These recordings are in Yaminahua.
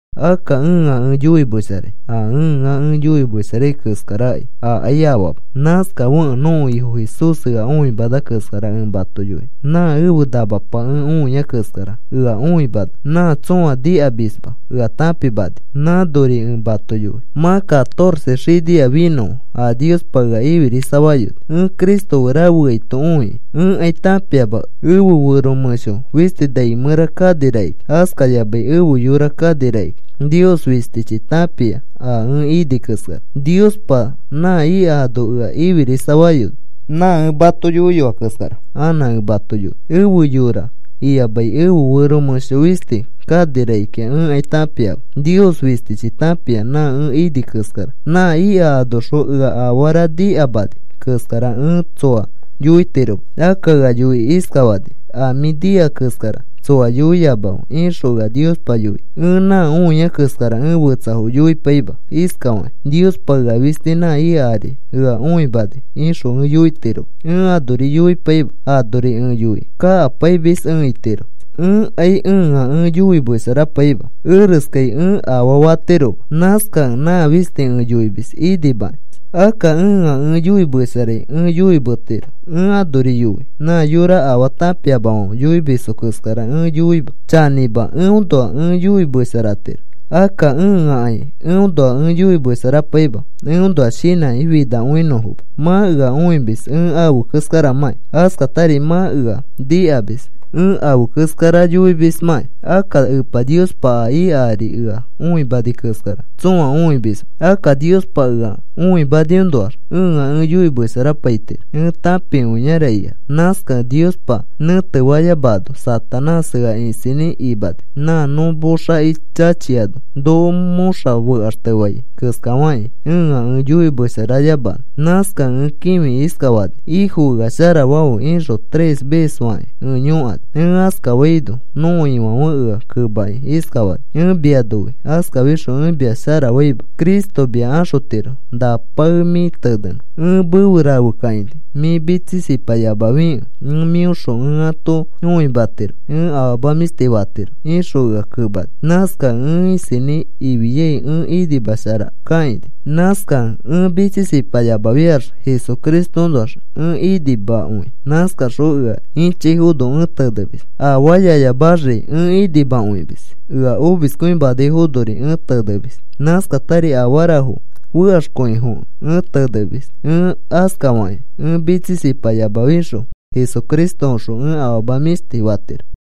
Akka ẽa ẽ yoimesharai. A ẽa ẽ yoimesharai keskarakai akai afaama. Nãskafekẽ nõko Ifo Jesús ea õimana keskara ẽ mato yoinõ. Nã ẽfe namapa ẽ õiai keskara ea õimana. Nã tsõa nikamisma ea tãpimani. Nãnori ẽ mato yoi. Mã catorce xinia finõa a Niospa ea ifirisafayoni, ẽ Cristo fe rafeaito õikĩ. Ẽkai tãpiama ẽfe fero mẽsho fisti nai mẽra kani rakikĩa, askayamai ẽfe yora kani rakikĩa. Nios fistichi tãpia a ẽ ini keskara. Niospa nã ika ano ea ifirisafayoni. Nã ẽ mato yoiyoa keskara anã ẽ mato yoi. Ẽfe yora iyamai ẽfe fero mẽsho fisti kani rakikĩa ẽkai tãpiama. Nios fistichi tãpia nã ẽ ini keskara. Nã ika anoxõ ea afara nikamani keskara ẽ tsoa yoitiroma. Akka ea yoikĩ iskafani: “A mĩ nika keskara tsoa yoiyamafe,” ixõ ea Niospa yoini. Ẽ nã õia keskara ẽ fetsafo yoipaima iskafakĩ: “Niospa ea fisti nã ika ari ea õimani,” ixõ ẽ yoitiroma. Ẽ anori yoipaima. Anori ẽ yoi kakapaimis ẽ itiro. Ẽkai ẽa ẽ yoimesharapaima. Ereskai ẽ afaa fatiroma. Nãskakẽ nã fisti ẽ yoimis inimakĩ. Akka ẽa ẽ yoimesharai ẽ yoimetiro. Ẽ anori yoi nã yora afaa tãpiamafãfe yoimisfo keskara ẽ yoima. Chanĩmakõi eõnoa ẽ yoimesharatiro. Akka ẽakai eõnoa ẽ yoimesharapaima eõnoa shinãkĩ finakõinõfoma. Mã ea õimis ẽ afe keskaramãkĩ, askatari mã ea nikamis ẽ afe keskara yoimismãkĩ. Akka Epa Niospa a ika ari ea õimani keskara tsõa õimisma. Akka Niospa ea õimaniõnoax ẽa ẽ yoimesharapaitiro ẽ tãpikõiara ikax. Nãskakẽ Niospa nẽtefayamano Satanás ea isinĩ imani nã nõ moxaki chachiano noko mõxa fekaxtefai keskafakĩ ẽa ẽ yoimesharayamanõ. Nãskakẽ ẽ kĩfikĩ iskafani: “Ifo, ea sharafafe,” ixõ tres ves fakĩ ẽ yõkani. Ẽ askafaito nõko Ifãfe ea kemakĩ iskafani: “Ẽ mia noi. Askafixõ ẽ mia sharafaima. Cristo mia axotiro na pae mĩ tenenõ ẽ mefe rafekakaini. Mĩ mitsisipayamafikẽ ẽ mĩõxõ ẽ ato õimatiro ẽ afama mĩshti fatiro,” ixõ ea kemani. Nãskakẽ ẽ isinĩ ifiai ẽ inimasharakakaini. Nãskakẽ ẽ mitsisipayamafiax Jesucristoõnoax ẽ inimakõi. Nãskaxõ ea ĩchaifono ẽ tenemis, afaayayamaxri ẽ inimakõimis ea omiskõimanaifonori ẽ tenemis. Nãskatari afarafo fekaxkõifekẽ ẽ tenemis. Ẽ askafakĩ ẽ mitsisipayamafixõ Jesucristoõxõ ẽ afama mĩshti fatiro.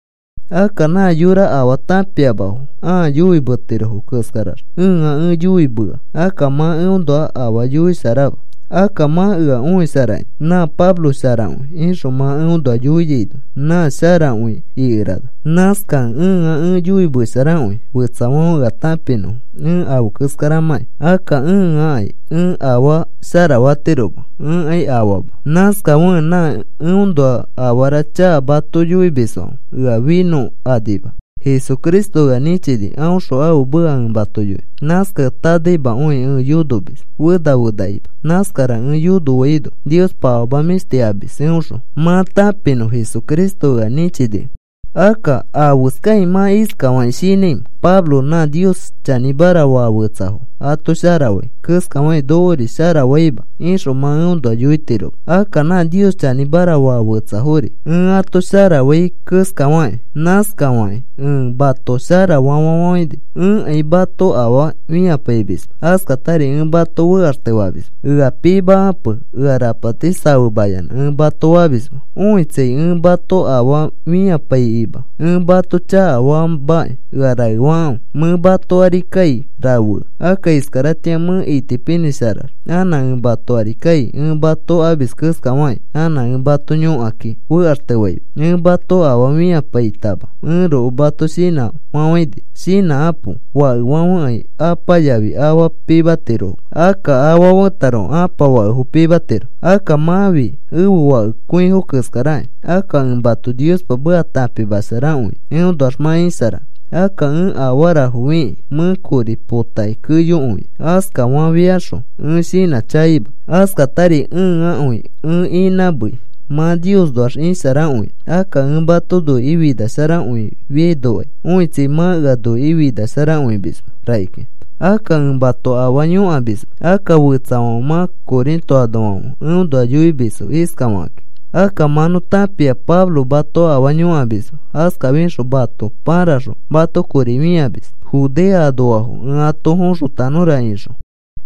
Akka nã yora afaa tãpiamafo ãa yoimetirofo keskarax ẽa ẽ yoimea. Akka mã eõnoa afaa yoisharama. Akka mã ea õisharakĩ, “Nã Pablo sharakõi,” ixõ mã eõnoa yoiano nã sharakõi ikerana. Nãskakẽ ẽa ẽ yoimesharakõi fetsafãfe ea tãpinõfo ẽ afe keskaramãki. Akka ẽakai ẽ afaa asharatiroma. Ẽkai afaama. Nãskafekẽ nã eõnoa afara chaka mato yoimisfãfe ea finõkanima. Jesucristo ea nĩchini aõxõ ãfe meka ẽ mato yoinõ. Nãskakẽ tanaimakõi ẽ yonomis fena fenakima. Nãskara ẽ yonofaino Niospa afama mĩshti amis eõxõ mã tãpinõ Jesucristo ea nĩchinikẽ. Akka, ¿afeskakĩ mã iskafakĩ shinãimẽ? “Pablo nã Nios chanĩmara faa fetsafo ato shara fai keskafakĩ nokori shara faima,” ixõ mã eõnoa yoitiroma. Akka nã Nios chanĩmara faa fetsafori ẽ ato shara fai keskafakĩ, nãskarifakĩ ẽ mato sharafa fafafãini. Ẽkai mato afaa fĩapaimisma. Askatari ẽ mato fekaxtefamisma. Ea pimakape ea rapati safemayanã ẽ mato famisma. Õitsai, ẽ mato afaa fĩapaikima ẽ mato chakafaamakĩ ea raefakãfe. Mẽ mato ari kai rafea. Akka iskaratĩa mẽ itipinĩsharax anã ẽ mato ari kai. Ẽ mato amis keskafakĩ anã ẽ mato yõkakĩ fekaxtefaima. Ẽ mato afaa fĩapaitama ẽroko mato shinãfafãini. Shinãkapo. Fakefãfekai apa yafi afa pimatiroma. Akka afa fetaroko apa fakefo pimatiro. Akka mãfi ẽfe fakekõifo keskarakĩ. Akka ẽ mato Niospa meka tãpimasharakõia eõnoax mã isharanõ. Akka ẽ afarafo fikĩ mẽ kori potakĩ keyokõia, askafafiaxõ ẽ shinãchakaima, askatari ẽakõi ẽ inãmei mã Niosnoax isharakõinõ. Akka ẽ mato noikĩ finasharakõifianokai õitsai mã ea noikĩ finasharakõimisma rakikĩa. Akka ẽ mato afaa yõkamisma. Akka fetsafãfe mã Corinto anoafãfe eõnoa yoimisfo iskafakakĩ: “Akka mã nõ tãpia Pablo mato afaa yõkamisma. Askafixõ mato pãraxõ mato kori fĩamis, Judea anoafo ẽ ato foxotanõra,” ixõ.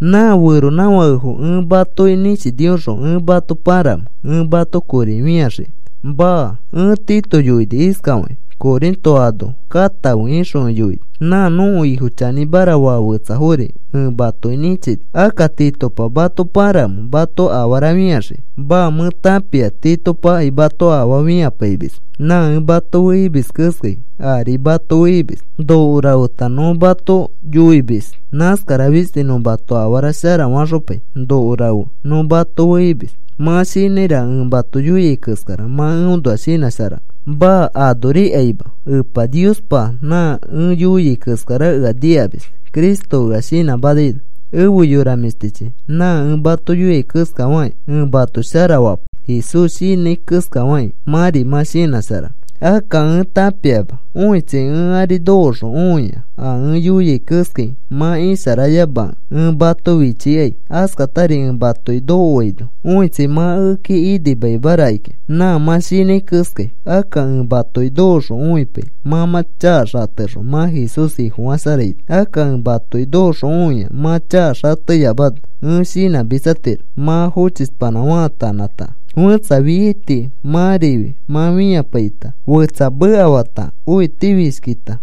¿Nã feronãfakefo ẽ matoki nĩchinioxõ ẽ mato pãramẽ ẽ mato kori fĩaxiki? Maa. Ẽ Tito yoini iskafakĩ: “Corinto ano katãfe,” ixõ ẽ yoini. Nã nõko Ifo chanĩmara faa fetsafori ẽ matoki nĩchini. Akka, ¿Titopa mato pãramẽ mato afara fĩaxiki? Maa. Mẽ tãpia Titopakai mato afaa fĩapaimisma. Nã ẽ mato fe imis keskai ari mato fe imis. Noko rafeta nõ mato yoimis. Nãskara fisti nõ mato afara shara faxopai noko rafe nõ mato fe imis. Mã shinãiraka ẽ mato yoiai keskara mã eõnoa shinãsharanõ. Maa. Anorikaima. Epa Niospa nã ẽ yoiai keskara ea nikamis Cristo ea shinãmanaino. Efe yora mĩshtichi, nã ẽ mato yoiai keskafakĩ ẽ mato shara fapai Jesús shinãi keskafakĩ mãri mã shinãsharanõ. Akka ẽ tãpiama, õitsai, ẽ ari nokoxõ õia a ẽ yoiai keskai mã isharayamakẽ ẽ mato fichikai. Askatari ẽ matoki nokoaino õitsai, mã ekeki inimaima rakikĩa nã mã shinãi keskai. Akka ẽ matoki nokoxõ õipai mã mã chaka xatexõ mã Jesús Ifofasharaino. Akka ẽ matoki nokoxõ õia mã chaka xateyamano ẽ shinãmitsatiro. Mã fochishpanã faatanãta, fẽtsa fiaiti mãrifi mã fipaita, fetsa mekafata, õitifishkita,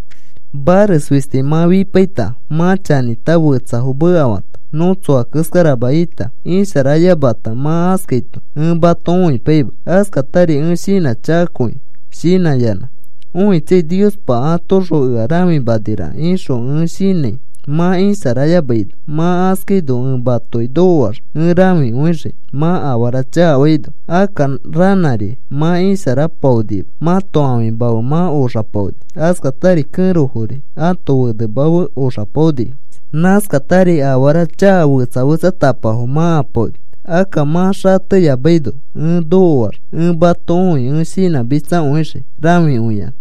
mares fisti mã fipaita, mã chanĩta, fetsafo mekafata, nõ tsoa keskarama ita, isharayamata, mã askaito ẽ mato õipaima. Nãskatari ẽ shinãchakakõi, shinãyanã õitsai Niospa atoõxõ ea rãfimaniraka ixõ ẽ shinãi mã isharayamaino. Mã askaino ẽ matoki nokoax ẽ rãfikõixii mã afara chakafaino. Akka ranãri mã isharapaonima. Mãto ãfima fe mã oxapaoni. Askatari kẽrofori ãto fenema fe oxapaonifo. Nãskatari afara chakafo fetsa fetsatapafo mã apaoni. Akka mã xateyamaino ẽ nokoax ẽ mato õi ẽ shinãmitsakõixii, rãfikõiyanã.